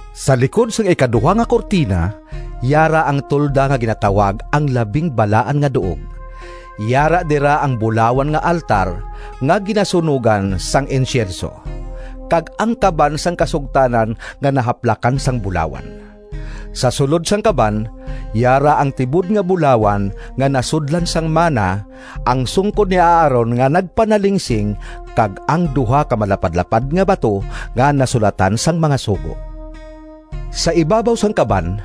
Sa likod sang ikaduha nga kurtina yara ang tolda nga ginatawag ang Labing Balaan nga Duog. Yara dira ang bulawan nga altar nga ginasunogan sang insyenso, kag ang kaban sang kasugtanan nga nahaklapan sang bulawan. Sa sulod sang kaban yara ang tibod nga bulawan nga nasudlan sang mana, ang sungkod ni Aaron nga nagpanalingsing kag ang duha ka malapadlapad nga bato nga nasulatan sang mga sugo. Sa ibabaw sang kaban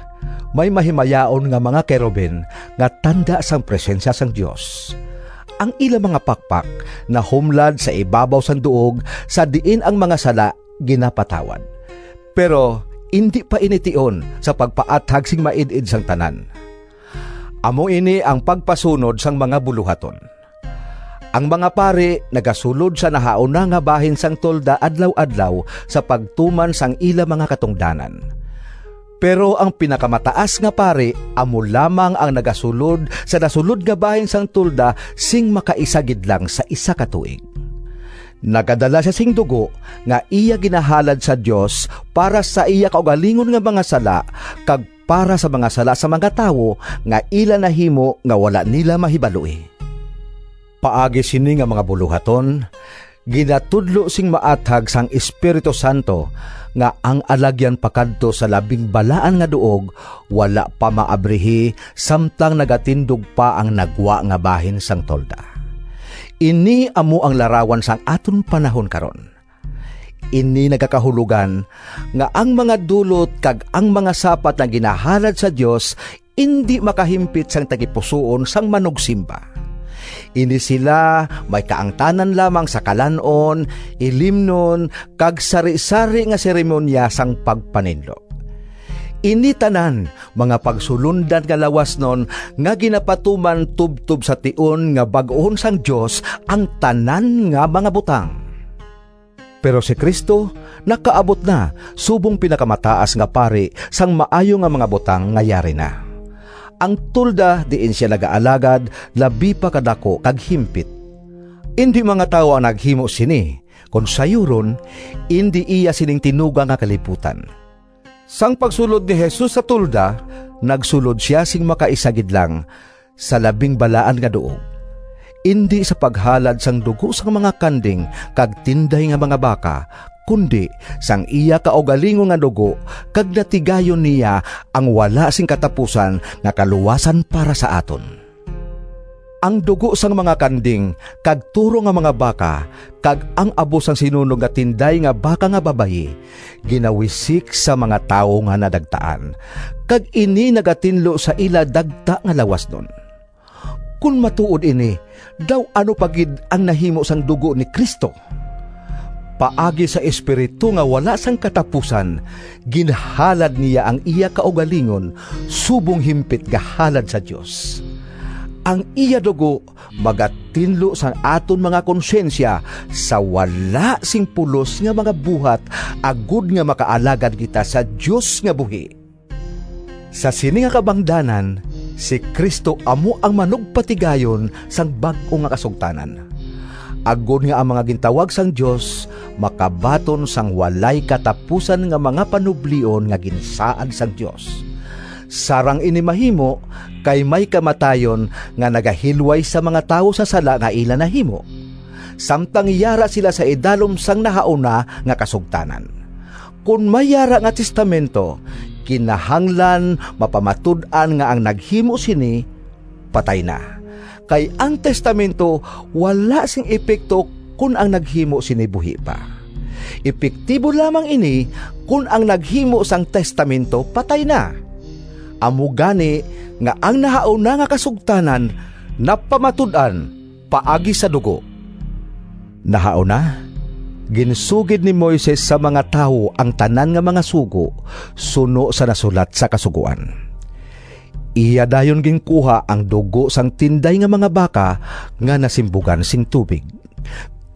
may mahimayaon nga mga kerubin nga tanda sang Presensya sang Dios. Ang ila mga pakpak nahumlad sa ibabaw sang duog sa diin ang mga sala ginapatawad. Pero indi pa ini tion sa pagpaathag sing maid-id sang tanan. Amo ini ang pagpasunod sang mga bulohaton: ang mga pari nagasulod sa nahauna nga bahin sang tolda adlaw-adlaw sa pagtuman sang ila mga katungdanan. Pero ang Pinakamataas nga Pari amo lamang ang nagasulod sa nasulod nga bahin sang tolda sing makaisa gid lang sa isa ka tuig. Nagadala sia sing dugo nga iya ginahalad sa Dios para sa iya kaugalingon nga mga sala kag para sa mga sala sang mga tawo nga ila nahimo nga wala nila mahibaloi. Paagi sini nga mga bulohaton ginatudlo sing maathag sang Espiritu Santo nga ang alagyan pakadto sa Labing Balaan nga Duog wala pa maabrihi samtang nagatindog pa ang nagwa nga bahin sang tolda. Ini amo ang larawan sang aton panahon karon. Ini nagakahulogan nga ang mga dulot kag ang mga sapat nga ginahalad sa Dios indi makahimpit sang tagipusoon sang manugsimba. Ini sila may kaangtanan lamang sa kalan-on, ilimnon, kag sarisari nga seremoniya sang pagpaninlo. Ini tanan mga pagsulondan nga lawasnon nga ginapatuman tubtob sa tion nga bag-uhon sang Dios ang tanan nga mga butang. Pero si Cristo nakaabot na subong Pinakamataas nga Pari sang maayo nga mga butang nga yari na. Ang tolda diin sia nagaalagad labi pa ka daku kag himpit. Indi mga tawo ang naghimo sini, kon sayuron, indi iya sining tinuga nga kalibutan. Sang pagsulod ni Jesus sa tolda nagsulod sia sing makaisa gid lang sa Labing Balaan nga Duog, indi sa paghalad sang dugo sang mga kanding kag tinday nga mga baka, kundi, sang iya kaugalingon nga dugo kag natigayon niya ang wala sing katapusan nga kaluwasan para sa aton. Ang dugo sang mga kanding kag toro nga mga baka, kag ang abo sang sinunog nga tinday nga baka nga babayi ginawisik sa mga tawo nga nadagtaan, kag ini nagatinlo sa ila dagta nga lawasnon. Kon matuod ini, daw ano pa gid ang nahimo sang dugo ni Cristo! Paagi sa Espiritu nga wala sing katapusan ginhalad niya ang iya kaugalingon subong himpit nga halad sa Dios. Ang iya dugo magatinlo sang aton mga konsyensya sa wala sing pulos nga mga buhat, agod nga makaalagad kita sa Dios nga buhi. Sa sini nga kabangdanan si Cristo amo ang manugpatigayon sang bag-o nga kasugtanan, agod nga ang mga gintawag sang Dios makabaton sang walay katapusan nga mga panublion nga ginsaad sang Dios. Sarang ini mahimo kay may kamatayon nga nagahilway sa mga tawo sa sala nga ila nahimo, samtang yara sila sa idalom sang nahauna nga kasugtanan. Kon may yara nga testamento, kinahanglan mapamatud-an nga ang naghimo sini patay na. Kay ang testamento wala sing epekto kon ang naghimo sini buhi pa. Epektibo lamang ini kon ang naghimo sang testamento patay na. Amo gani nga ang nahauna nga kasugtanan napamatud-an paagi sa dugo. Nahauna, ginsugid ni Moises sa mga tawo ang tanan nga mga sugo, suno sa nasulat sa Kasugoan. Iya dayon ginkuha ang dugo sang tinday nga mga baka nga nasimbugan sing tubig,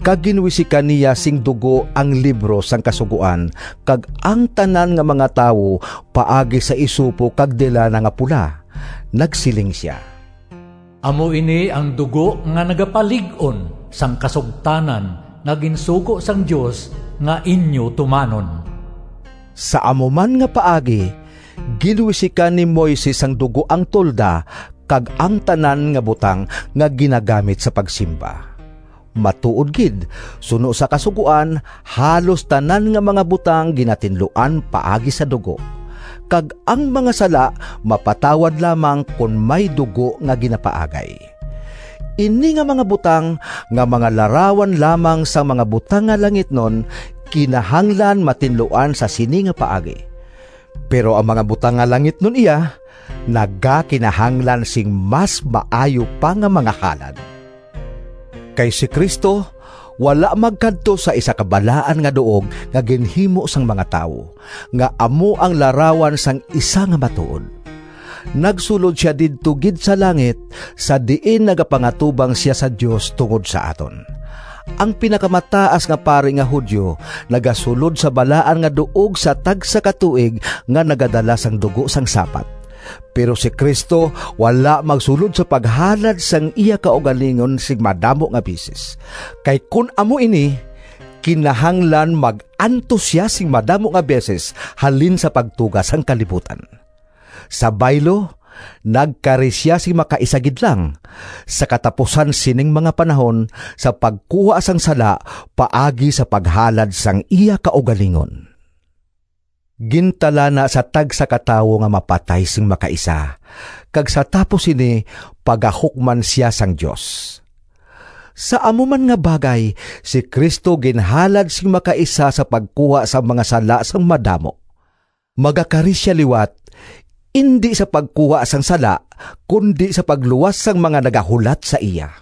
kag ginwisikan niya sing dugo ang libro sang Kasugoan kag ang tanan nga mga tawo paagi sa isopo kag delana nga pula. Nagsiling sia, “Amo ini ang dugo nga nagapalig-on sang kasugtanan nga ginsugo sang Dios nga inyo tumanon.” Sa amo man nga paagi, ginwisikan ni Moises sang dugo ang tolda kag ang tanan nga butang nga ginagamit sa pagsimba. Matuod gid, suno sa Kasugoan, halos tanan nga mga butang ginatinluan paagi sa dugo, kag ang mga sala mapatawad lamang kon may dugo nga ginapaagay. Ini nga mga butang, nga mga larawan lamang sang mga butang nga langitnon, kinahanglan matinluan sa sini nga paagi. Pero ang mga butang nga langitnon iya nagakinahanglan sing mas maayo pa nga mga halad. Kay si Cristo wala magkadto sa isa ka balaan nga duog nga ginhimo sang mga tawo, nga amo ang larawan sang isa nga matuod. Nagsulod sia didto gid sa langit, sa diin nagapangatubang sia sa Dios tungod sa aton. Ang Pinakamataas nga Pari nga Judio nagasulod sa Balaan nga Duog sa tagsa ka tuig nga nagadala sang dugo sang sapat. Pero si Cristo wala magsulod sa paghalad sang iya kaugalingon sing madamo nga beses. Kay kon amo ini, kinahanglan mag-antos sia sing madamo nga beses halin sa pagtuga sang kalibutan. Sa baylo, nagkari sia sing makaisa gid lang, sa katapusan sining mga panahon, sa pagkuha sang sala paagi sa paghalad sang iya kaugalingon. Gintalana sa tagsa ka tawo nga mapatay sing makaisa, kag sa tapos sini pagahukman sia sang Dios. Sa amo man nga bagay, si Cristo ginhalad sing makaisa sa pagkuha sang mga sala sang madamo. Magakari sia liwat, indi sa pagkuha sang sala, kundi sa pagluwas sang mga nagahulat sa iya.